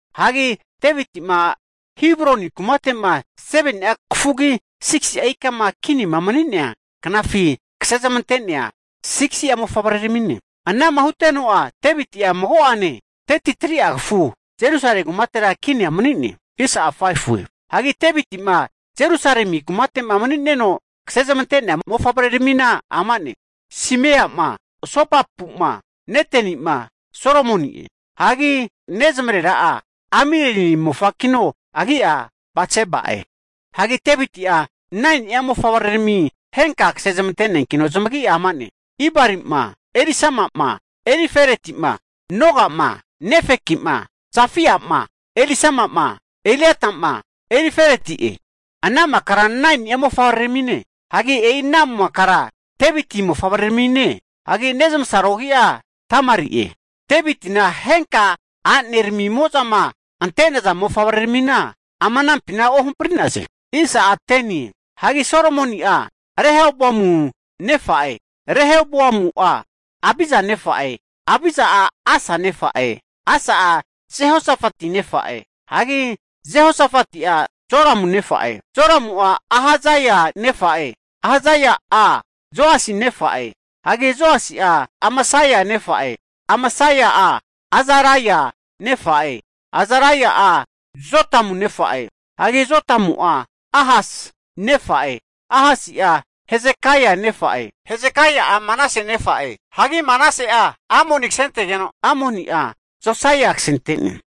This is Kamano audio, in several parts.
Hagi Deviti'ma Hebroni kumate'ma 7ni'a kafugi 6si'a ikama kinima mani'nea knafi kasezmante'nea 6si'a mofavreramine. Anama huteno'a Deviti'a mago'ane 33'a kafu Jerusalemi kumatera kinia mani'ne. Hagi Deviti'ma Jerusalemi kumate'ma mani'neno kasezmante'nea mofavreramina amane, Simea'ma, Sobabu'ma, Neteni'ma, Solomoni'e. Hagi nezmarera'a Amieli mofakino, agi'a Batseba'e. Hagi Deviti'a 9ni'a mofavrerami henka kase zmante'neankino zamagi'a amane, Ibari'ma, Elisama'ma, Elifeleti'ma, Noga'ma Nefeki'ma, Jafia'ma, magora ru Elisama'ma, Eliada'ma, Elifeleti'e. Ana makara 9ni'a mofavreramine. Hagi e'i ana makara Deviti mofavreramine. Hagi nezamasaro agi'a Tamari'e. Devitina henka a'nearamimo'za ante'naza mofavreramina ama anampina ohampri'naze. Hagi Solomoni'a Rehoboamu nefa'e, Rehoboamu'a Abiza nefa'e, Abiza'a Asa nefa'e, Asa'a Jehosofati nefa'e, hagi Jehosofati'a Joramu nefa'e, Joramu'a Ahazia nefa'e, Ahazia'a Joasi nefa'e, hagi Joasi'a Amasia nefa'e, Amasia'a Azaria nefa'e, Azaria'a Jotamu nefa'e. Hagi Jotamu'a Ahasi nefa'e, Ahasi'a Hesekaia nefa'e, Hesekaia'a Manase nefa'e, hagi Manase'a Amoni kasentegeno, Amoni'a Josaia kasente'ne.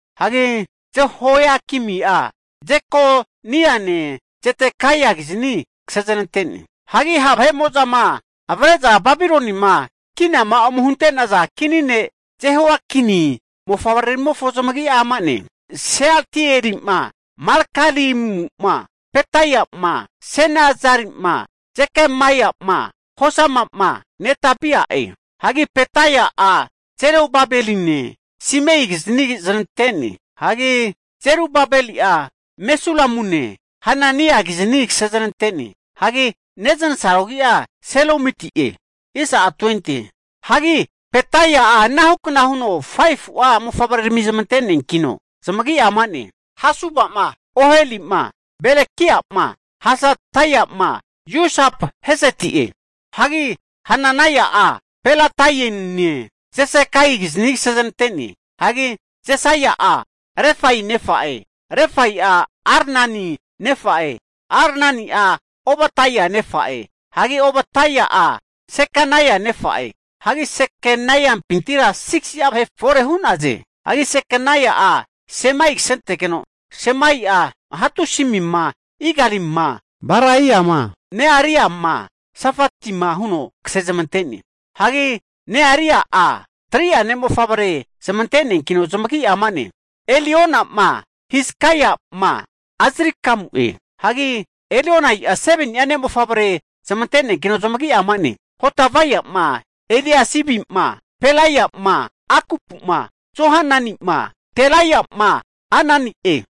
Hagi Jehoiakimi'a Jekoniane Zedekaiakizni kasezanante'ne. Hagi ha' vahe'mo'zama avre'za Babilonima kinama ome hunte'naza kini ne' Jehoiakini mofavreramimofo zamagi'a ama'ne, Sealtieli'ma, Malkiramu'ma, Pedaia'ma, Senazari'ma, Jekamaia'ma, Hosama'ma, Nedabia'e. Hagi Pedai'a Zerubabeline Simeikizni zanante'ne. Hagi Zerubabeli'a Mesulamune Hananiakizni zanante'ne. Hagi neznasaro agi'a Selomiti'e. Hagi Pedai'a anahukna huno 5fu'a mofavrerami zamante'neankino zamagi'a ama'ne, Hasuba'ma, Oheli'ma, Berekia'ma, Hasadaia'ma, Jusap-heseti'e. Hagi Hananaia'a Pelataiane, Jesaiakizni kase zanante'ne. Hagi Jesaia'a Refaia nefa'e, Refaia'a Arnani nefa'e, Arnani'a Obadaia nefa'e, hagi Obadaia'a Sekanaia nefa'e. Hagi Sekanaimpintira 6si'a vahe forera hu'naze. Hagi Sekanai'a Semaia kasentetegeno, Semaia'a Hatusi'ma, Igali'ma, Baraia'ma, Nearia'ma, Safatima huno kasezmante'ne. Hagi Nearia'a 3'a ne' mofavrerami zmante'neankino, zamagi'a ama'ne, Eliona'ma, Hizkaia'ma, Azrikamu'e. Hagi Elionai'a 7ni'a ne' mofavrerami zmante'neankino, zamagi'a ama'ne, Hodavia'ma, Eliasibi'ma, Pelaia'ma, Akupu'ma, Johanani'ma, Delaia'ma Anani'e.